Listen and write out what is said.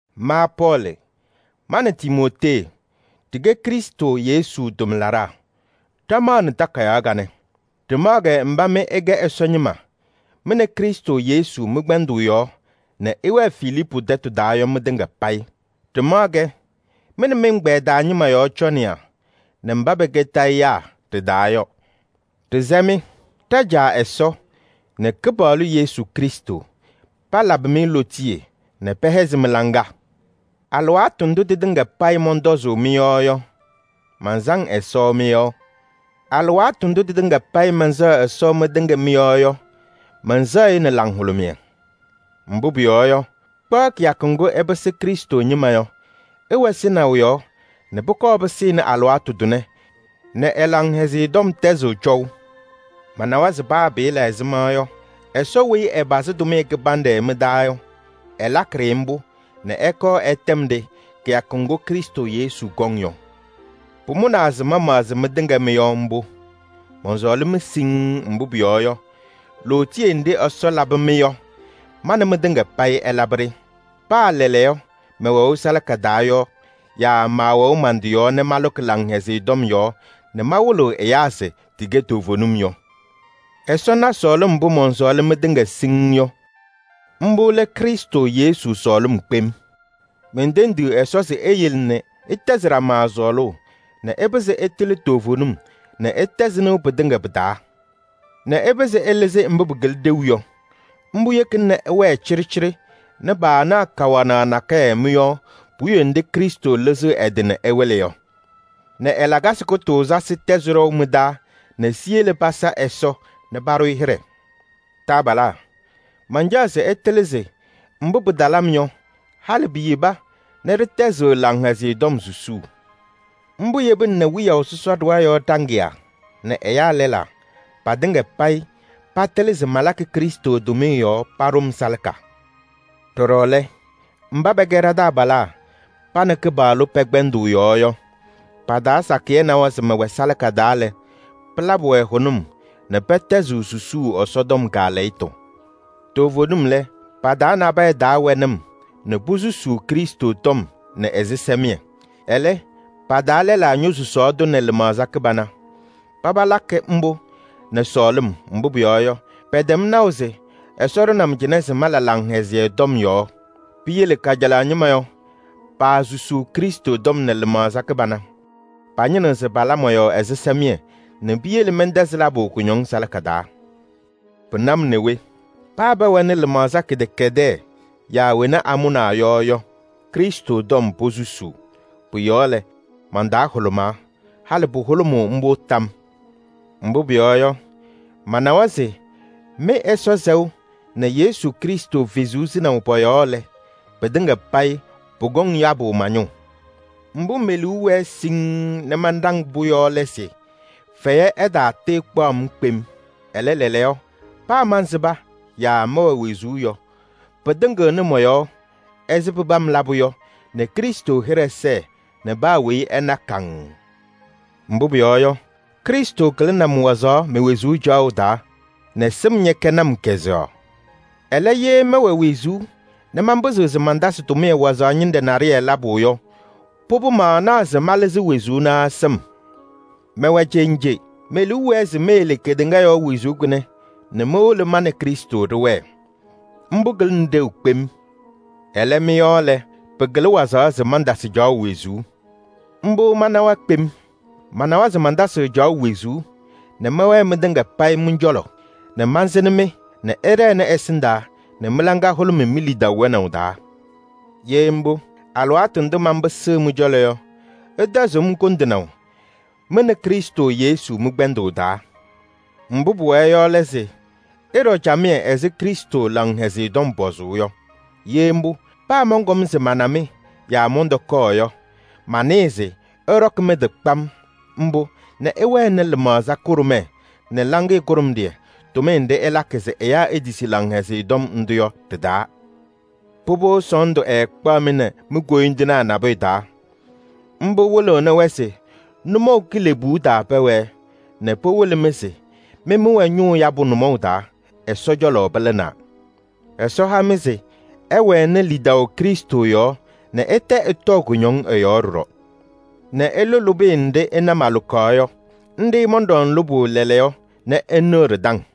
Ma Pɔɔlɩ, ma nɛ Timootee ɖɩkɛ Krɩstʋ Yesu tʋmlaɖaa, ɖamaɣnɩ takayaɣ kanɛ. Ɖɩmaɣ-kɛ mba mɩ ɩkɛ Ɛsɔ ñɩma mɩ nɛ Krɩstʋ Yesu mɩ-kpɛndʋʋ yɔɔ nɛ ɩwɛɛ Filiipu tɛtʋ taa yɔ mɩtɩŋa payɩ. Ɖɩmaɣ-kɛ mɩ nɛ mɩ-ɛgbɛyɛ taa ñɩma yɔɔ cɔnɩyaa nɛ mba pɛkɛ tayɩyaa ɖɩ-taa yɔ. Ɖɩsɛ-mɩ: ɖa-Caa Ɛsɔ nɛ Kɩpaɣlʋ Yesu Krɩstʋ palabɩ-mɩ lootiye nɛ pɛhɛzɩ mɩ-laŋa. Alɩwaatʋ ndʋ tɩtɩŋa payɩ mɔntɔzʋʋ mɩ-yɔɔ yɔ, mansaŋ Ɛsɔ mɩ-yɔɔ. Alɩwaatʋ ndʋ tɩtɩŋa payɩ mɛnsɛɣ Ɛsɔ mɩtɩŋa mɩ-yɔɔ yɔ, mɛnsɛɣ-ɩ nɛ laŋhʋlʋmɩyɛ. Mbʋ pʋyɔɔ yɔ, kpaɣ kɩyakʋ ŋgʋ ɩpɩsɩ Krɩstʋ ñɩma yɔ, ɩwɛ sɩnaʋ yɔɔ nɛ pʋkɔɔ pɩsɩnɩ alɩwaatʋ tʋnɛ nɛ ɛ-Laŋhɛzɩyɛ Tɔm tɛzɩɣ cɔʋ. Manawa se paa pɩɩla ɛzɩma yɔ, Ɛsɔ weyi ɛpazɩ tʋmɩyɛ kɩbanɖɛ mɩ-taa yɔ, ɛlakɩ-ɖɩ mbʋ nɛ ɛkɔɔ ɛtɛm-ɖɩ kɩyakʋ ŋgʋ Krɩstʋ Yesu kɔŋ yɔ. Pʋmʋnaa se mamaɣzɩ mɩtɩŋa mɩ-yɔɔ mbʋ. Mɔnsɔɔlɩ-mɩ siŋŋ, mbʋ pʋyɔɔ yɔ, lootiye nɖɩ Ɛsɔ labɩ-mɩ yɔ, ma nɛ mɩtɩŋa payɩ ɛlabɩ-ɖɩ. Paa lɛɛlɛɛyɔ mɛwɛʋ salaka taa yɔ yaa maawɛʋ man-tɩ yɔɔ nɛ malʋkɩ Laŋhɛzɩyɛ Tɔm yɔɔ nɛ mawɩlɩɣ ɛyaa se tɩkɛ toovenim yɔ. Ɛsɔ na sɔɔlɩm mbʋ mɔnsɔɔlɩ mɩtɩŋa siŋŋ yɔ. Mbʋ lɛ Krɩstʋ Yesu sɔɔlɩm kpem. Mentendiɣ Ɛsɔ se eyele nɛ ɩtɛzɩ ɖama sɔɔlʋʋ nɛ ɩpɩzɩ ɩtɩlɩ toovenim nɛ ɩtɛzɩ nɩʋ pɩtɩŋa pɩ-taa nɛ ɩpɩzɩ ɩlɩzɩ mbʋ pɩkɩlɩ ɖeu yɔ. Mbʋ yekina nɛ ɩwɛɛ cɩɖɩcɩɖɩ nɛ paanaɣ kawanaɣ nakɛyɛ mɩ-yɔɔ puwiye nɖɩ Krɩstʋ lɩzɩɣ ɛ-tɩ nɛ ɛwɩlɩ yɔ nɛ ɛ-lakasɩ kʋtʋʋzasɩ tɛzɩ ɖɔʋ mɩ-taa nɛ siyele pasa Ɛsɔ nɛ paɖʋ-ɩ hɩɖɛ. Taabalaa! Mancaɣ se ɩtɩlɩ se mbʋ pɩtalɩ-m yɔ, halɩ piyeba nɛ ɖɩtɛzɩɣ Laŋhɛzɩyɛ Tɔm susuu. Mbʋ yebina nɛ wiyaʋ sɔsɔ ɖɩɣa yɔɔ ɖaŋɩyaa nɛ ɛyaa lɛlaa, patɩŋa payɩ patɩlɩ se malakɩ Krɩstʋ tʋmɩyɛ yɔɔ paɖʋ-m salaka. Ɖɔɖɔ lɛ, mba pɛkɛ ɖa-taabalaa pa nɛ Kɩpaɣlʋ pɛ-kpɛndʋʋ yɔɔ yɔ, pa-taa sakɩyɛ nawa se mɛwɛ salaka taa lɛ, pɩlabɩ-wɛ hʋnʋm nɛ pɛtɛzɩɣ susuu Ɛsɔtɔm kaalɛyɩtʋ. Toovenim lɛ, pa-taa nabɛyɛ taa wɛnɩ-m nɛ posusuu Krɩstʋ tɔm nɛ ɛzɩsɛmɩyɛ. Ɛlɛ, pa-taa lɛlaa ñosusaɣ-tʋ nɛ lɩmaɣza kɩbana. Paba lakɩ mbʋ nɛ sɔɔlɩm, mbʋ pʋyɔɔ yɔ, pɛtɛm naʋ se Ɛsɔ ɖʋnɩ-m cɩnɛ se malʋ Laŋhɛzɩyɛ Tɔm yɔɔ. Piyele kajalaɣ ñɩma yɔ, paasusuu Krɩstʋ tɔm nɛ lɩmaɣza kɩbana. Pañɩnɩɣ se pala mɔ-yɔɔ ɛzɩsɛmɩyɛ nɛ piyele mɛntɛzɩ labʋ kʋñɔŋ salaka taa. Pɩna-m nɛ we! Paa pɛwɛnɩ lɩmaɣza kɩdɛkɛdɛɛ yaa wena amʋnaa yɔ yɔ, Krɩstʋ tɔm posusuu. Pʋ-yɔɔ lɛ, man-taa hʋlʋmaa. Halɩ pʋhʋlʋmʋʋ mbʋ tam yɔɔ. Mbʋ pʋyɔɔ yɔ, manawa se mɩ-Ɛsɔ sɛʋ nɛ Yesu Krɩstʋ Kalɩzaɣ sɩnaʋ pɔ-yɔɔ lɛ, pɩtɩŋa payɩ pʋkɔŋ yabʋ ma-ñʋʋ. Mbʋ me-liu wɛɛ siŋŋ nɛ manɖaŋ-pʋ yɔ lɛ se fɛyɛ ɛtaatɩɩkpaʋ-m kpem. Ɛlɛ, lɛɛlɛɛyɔ paa mansɩba yaa mɛwɛ wezuu yɔ, pɩtɩŋɩɣnɩ mɔ-yɔɔ ɛzɩ pɩpam labʋ yɔ nɛ Krɩstʋ hɩɖɛ sɛɛ nɛ paa weyi ɛna kaŋŋ. Mbʋ pʋyɔɔ yɔ, Krɩstʋ kɩlɩnɩ-m wazaɣ me-wezuu caɣʋ taa nɛ sɩm ñɛkɛnɩ-m kazʋwa. Ɛlɛ, ye mɛwɛ wezuu nɛ manpɩzɩɣ se mantasɩ tʋmɩyɛ wazaɣ ñɩnɖɛ naɖɩyɛ labʋ yɔ, pʋbʋ maanaɣ se malɩzɩ wezuu naa sɩm. Mɛwɛ cenje: me-liu wɛɛ se meyele kedeŋa yɔɔ wezuu kʋnɛ nɛ mowolo ma nɛ Krɩstʋ ɖɩwɛɛ. Mbʋ kɩlɩnɩ ɖeu kpem. Ɛlɛ, mɩ-yɔɔ lɛ, pɩkɩlɩ wazaɣ se mantasɩ caɣʋ wezuu. Mbʋ manawa kpem. Manawa se mantasɩɣ caɣʋ wezuu nɛ mɛwɛɛ mɩtɩŋa payɩ mɩ-cɔlɔ nɛ mansɩnɩ-mɩ nɛ ɩɖɛnɩ ɛsɩndaa nɛ mɩ-laŋa hʋlʋmɩ mi-lidaʋ wɛnaʋ taa. Ye mbʋ, alɩwaatʋ ndʋ manpɩsɩɣ mɩ-cɔlɔ yɔ, ɩtɛzɩɣ-m kʋndɩnaʋ mɩ nɛ Krɩstʋ Yesu mɩ-kpɛndʋʋ taa. Mbʋ pʋwɛɛ yɔ lɛ se: ɩɖɔ camɩyɛ ɛzɩ Krɩstʋ Laŋhɛzɩyɛ Tɔm pɔzʋʋ yɔ. Ye mbʋ, paa mɔnkɔm se mana-mɩ yaa mɔntɔkɔɔ yɔ, manɩɩ se ɩɖɔkɩ mɩ-tɩ kpam mbʋ nɛ ɩwɛnɩ lɩmaɣza kʋɖʋmɛɛ nɛ laŋɩyɛ kʋɖʋmɖɩyɛ, tʋmɩyɛ nɖɩ ɩlakɩ se ɛyaa etisi Laŋhɛzɩyɛ Tɔm ndʋ yɔ ɖɩ-taa. Pʋbʋ, sɔɔndʋ ɛɛkpaɣ-mɩ nɛ mi-koyindinaa nabʋyʋ taa. Mbʋ wɩlɩɣnɩ-wɛ se nʋmɔʋ kilebuu taa pɛwɛɛ nɛ pɩwɩlɩ-mɩ se mɩ mɩwɛ ñʋʋ yabʋ nʋmɔʋ taa, Ɛsɔ cɔlɔ pɩlɩnaa. Ɛsɔ ha-mɩ se ɩwɛnɩ lidaʋ Krɩstʋ yɔɔ nɛ ɩtɛ ɩtɔɔ kʋñɔŋ ɛ-yɔɔ ɖɔɖɔ nɛ ɩlʋ lʋbɩyɛ nɖɩ ɩna malʋkaɣ yɔ. Nɖɩ mɔnɖɔŋ lʋbʋ lɛɛlɛɛyɔ nɛ ɩnɩɣ ɖɩ-taŋ.